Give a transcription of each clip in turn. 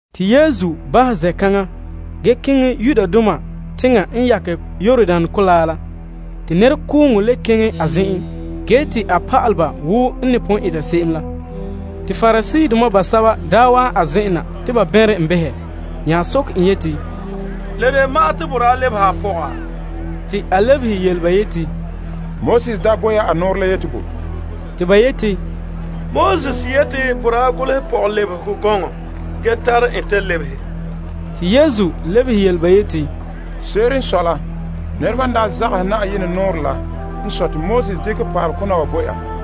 Yesu daa bahɛ zen'kaŋa ge keŋɛ Yudea teŋhe n yakɛ Yordan Kolaa la. Te nɛrekooŋɔ le keŋɛ a zen'en, ge a pa'ale ba wo n ne pon eta se'em la. Pariseedoma basɛba wa'an a zen'en na te ba bɛnrɛ en behɛ nya soke en yeti, La de ma'an te boraa lebehe a pɔga? Te a lebehe ba yeti, Moses daa bo ya a nɔɔrɛ la yeti bo? Te ba yeti, Moses yeti te boraa golehɛ pɔgɔlebehegɔ gɔŋɔ ge tare en ta lebehe. Yesu lebehe yele ba yeti, Nɛreba n daa zagahɛ Na'ayenɛ nɔɔrɛ la zuo n sɔe te Moses dekɛ pa'alekona wa bo ya.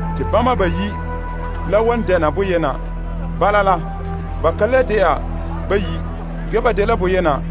te ba bayi' la lebege bonyenɛ. Bala la, ba ka le de'a bayi', ge ba dela boyena.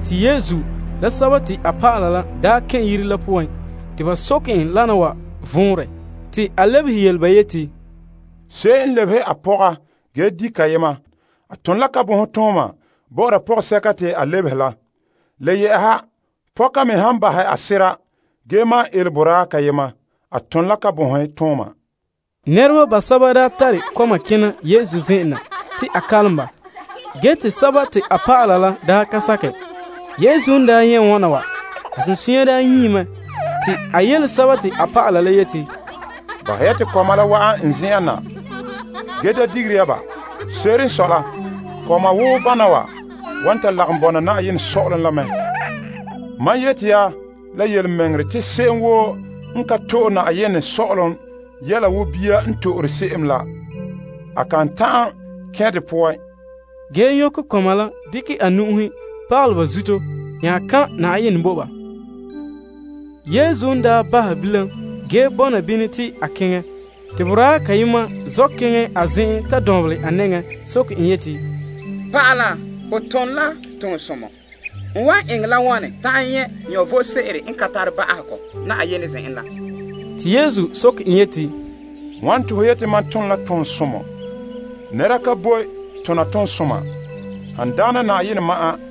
Yesu la a dɔlɔba la n daa kɛn' yire la poan te a dɔlɔba daa soke en wana wa vɔnrɛ. A lebehe ba yeti, Se'em n lebehe a pɔga ge di' kayema, a ton la kabonhe bɔ'ɔra pɔgɔsɛka te a lebehe la. Le yɛ'ɛha pɔka me han bahɛ a sera ge maan ele boraa kayema, a ton la kabonhe. Nɛreba basɛba daa tare kɔma kena Yesu zen'en na, te a kalom ba ge te a dɔlɔba la daa ka sakerɛ. Yesu n nyɛ' wana wa, a sunsunya nyie mɛ. Te a yele ba yeti, Bahɛ ya te kɔma la wa'an n zen'en na, ge da digere ya ba. Se'ere n sɔe la Yenɛ sɔ'ɔlom la dela kɔma ane wo bana wa denɛ. Mam yeti ya la yelemɛŋɛrɛ te se'em woo n ka to'e Yenɛ sɔ'ɔlom wo bia n to'ore se'em la, a kan ta'an kɛn' dɛ poan. Ge te a nyɔkɛ kɔma la dekɛ a nu'uhe pagalɛ ba zuto nya kan' som bo ba. Yesu n daa bahɛ bilam ge bɔna bini te a keŋɛ, te boraa kayema zɔ' keŋɛ a zen'en ta dɔnbelɛ a nɛŋa soke en yeti, Pa'ala Somɔ, n wan eŋɛ la wane ta'an nyɛ' vom sebo n ka tare ba'ahegɔ Yenɛ zen'en la? Yesu lebehe en yeti, Wane te ho yi'ira mam te Somɔ? Nɛra ka boe dɛna somɔ han dagɛna Yenɛ ma'an.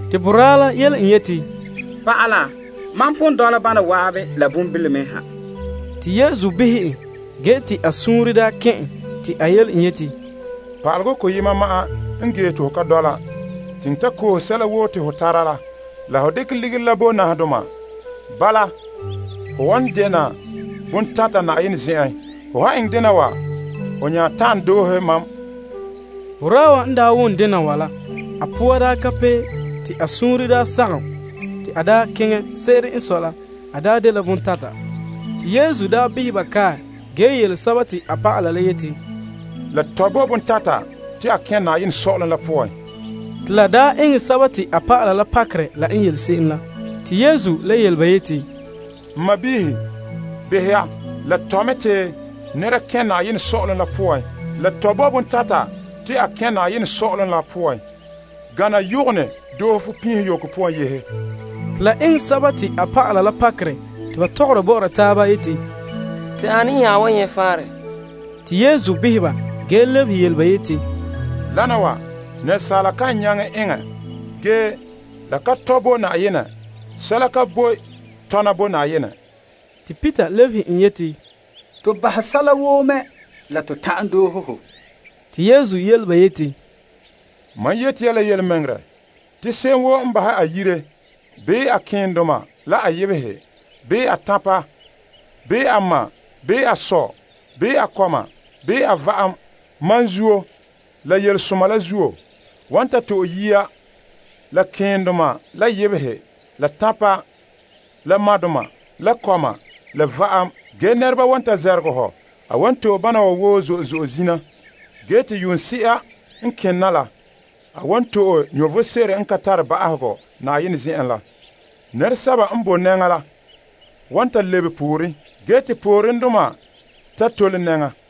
Boraa la yele en yeti, Pa'ala, mam pon dɔla bana zan'an la bonbilome ha. Yesu behɛ en ge te a suunre daa kɛn' en te a yele en yeti, Pa'alegɔ koyena ma'an n gee te ho ka dɔla. Keŋɛ ta koohe sɛla woo te ho tara la, ge dekɛ ligiri la bo nahadoma. Bala la ho wan dɛna bontata Yenɛ zen'en. Ho han eŋɛ dena wa ho nya ta'an doohe mam. Boraa wa n wom dena wa la, a poa ka pee ge a suunre sagom, te a keŋɛ. Se'ere n sɔe la a dela bontata. Te Yesu daa behɛ ba kae ge yele a dɔlɔba la yeti, La tɔe bo bontata te a kɛn' Yenɛ sɔ'ɔlom la poan! Te la daa eŋɛ a dɔlɔba la pakerɛ la n yele se'em la, te Yesu le yele ba yeti, N kɔma, la tɔ mɛ te nɛra kɛn' Yenɛ Sɔ'ɔlom la poan! La tɔe bo bontata te a kɛn' Yenɛ sɔ'ɔlom poan, gana yɔgɔnɛ doohe fupinho yoko poan yehe. Te la eŋɛ ba la pakerɛ te ba tɔgɔra bɔ'ɔra taaba yeti, Te ane n nya wan nyɛ' faanrɛ? Yesu behɛ ba ge yele ba yeti, Wana wa asaala kan nyaŋɛ eŋɛ ge la ka tɔe bo Yenɛ. Sɛla ka boe tɔna bo Yenɛ. Peter daa yele Yesu yeti, To bahɛ sɛla woo mɛ la to ta'an doohe hɔ. Yesu lebehe en yeti, Mam yeti ya la yelemɛŋɛrɛ, te se'em woo n bahɛ a yire bii a keendoma la a yebehe bii a tanpa bii a ma bii a sɔ bii a kɔma bii a va'am, mam la zuo la yelesoma la zuo, wan ta to'e yiya la keendoma la yebehe la tanpa la madoma la kɔma la va'am ge nɛreba wan ta namehe ho. A wan to'e bana wa woo zo'e zo'e zina ge te yuunse'a n kena la, a wan to'e vom sebo n ka tare ba'ahegɔ. Nɛresɛba n boe nɛŋa la, wan ta lebe pooren, ge te poorendoma ta tole nɛŋa.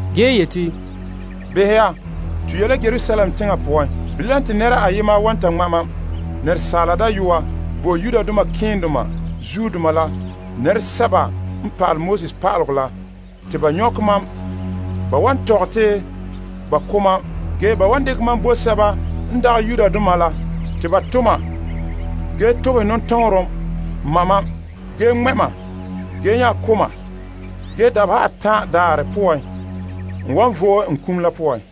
A yeti, To ye' la Yerusalem teŋa poan ge te ba wan ta ŋma' Asaala Dayɔa bo malema keendoma la pa'alegɔ pa'aleba la te ba nyɔkɛ en. Ba wan tɔgɛ te ba ko' en ge ba wan dekɛ en bo sɛba n dagɛ Yudoma la. Ba wan to' en ge tobehɛ nɔtɔɔnrom en ge ŋmɛ' en ge nya ko' en. Ge, dabeha atan' daarɛ poan a wan vo'e a kum la poan.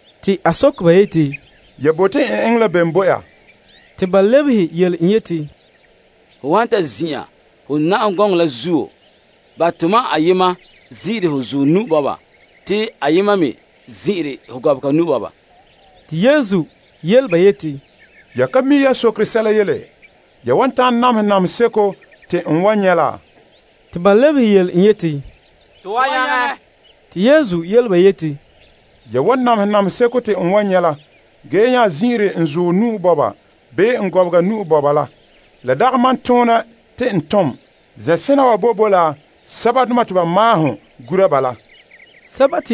A soke ba yeti, Ya bote n eŋɛ la bene bo ya? Ba lebehe en yeti, Ho han ta zin'an ho na'am gɔŋɔ la zuo, bahɛ te tomam ayema zin'ire ho zuɔ te ayema me zin'ire ho gɔbega. Yesu yele ba yeti, Ya ka mi' yan sokere sɛla yele. Ya wan ta'an namehɛ namehe seko te n wan nyɛ' la? Ba lebehe en yeti, To wan nyaŋɛ. Yesu yele ba yeti, Ya wan seren namehɛ namehe seko te n wan nyɛ' la, ge yan zin'ire n zuɔ bii n gɔbega la, dagɛ mam toonɛ te n tom. Zen'sena wa boe bo la sɛbadoma te ba maahom gura ba la.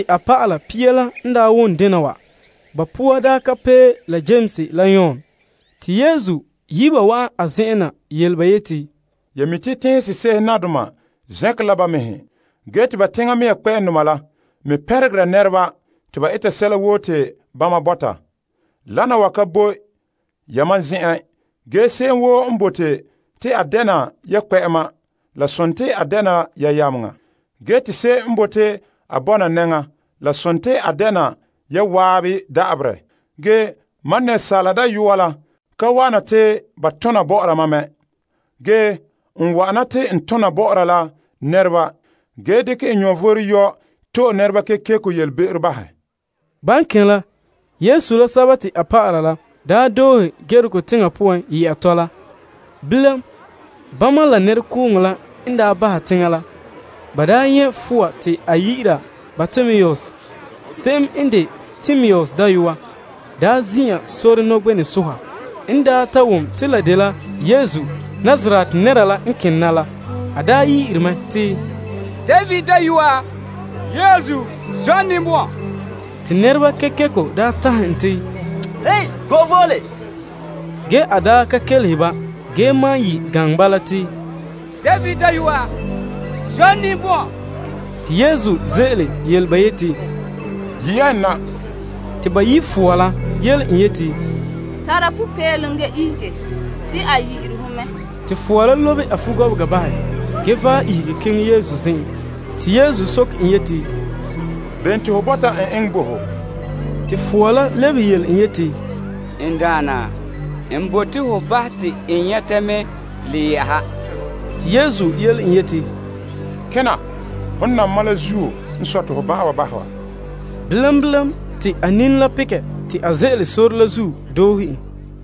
A dɔlɔba pia la n daa wom dena wa, ba poore daa ka pee la Yames la Yon. Yesu yi' ba te ba wa'an a zen'en yele ba yeti, Ya mi' te teŋhe sese'ehe nadoma zɛnkerɛ la ba mɛhe, ge te ba teŋa mea kpɛ'ɛndoma la me pɛnregere nɛreba te ba eta sɛla woo te bama bɔta. Wana wa ka boe yamam zen'an. Ge se'em woo n bote te a dɛna ya kpɛ'ɛma, a dɛna ya yameŋa. Ge te se'em n bote te a bɔna nɛŋa, a dɛna ya zan'an da'aberɛ. Ge Asaala Dayɔa la ka wa'ana te ba tona bɔ'ɔra en mɛ. A wa'ana te a ton tona bɔ'ɔra nɛreba ge dekɛ a vom yɔ' to'e nɛreba kekeko yelebe'ero bahɛ. Ban daa kene la, Yesu la a dɔlɔba la daa doohe Yeriko teŋa poan yɛ'a tɔla. Bama la nɛrekooŋɔ la n bahɛ teŋa la, ba nyɛ' fowa te ba yi'ira Bartimaeus se'em n de Timaeus dayɔa, zin'an sore nɔgbenɛ soha. N ta wom te la dela Yesu Nazaret nɛra la n kena la, a yi'ira mɛ te, Yesu, David dayɔa, zɔ' n ninbɔn'ɔn! Nɛreba kekeko tanhɛ en te a go'e vole ge a malom yi' gaŋɛ bala te, David dayɔa, zɔ' n ninbɔn'ɔn! Yesu ze'ele yele ba yeti, Yi' ya en na. Te ba yi' fowa la yele en yeti, Tara popeelom! Ihege! A yi'ire ho mɛ. Fowa la lobe a fugɔbega bahɛ ge ihege keŋɛ Yesu zen'en. Yesu soke en yeti, Bene te ho bɔta n eŋɛ bo ho? Fowa la lebehe en yeti, Naa, n bote ho bahɛ te n nyɛta mɛ. Yesu yele en yeti, Kena. Hon nam mam la zuo n sɔe te ho ban'an wa bahɛ wa. Bilam, te a nini la pekɛ te a ze'ele sore la zuo doohe en.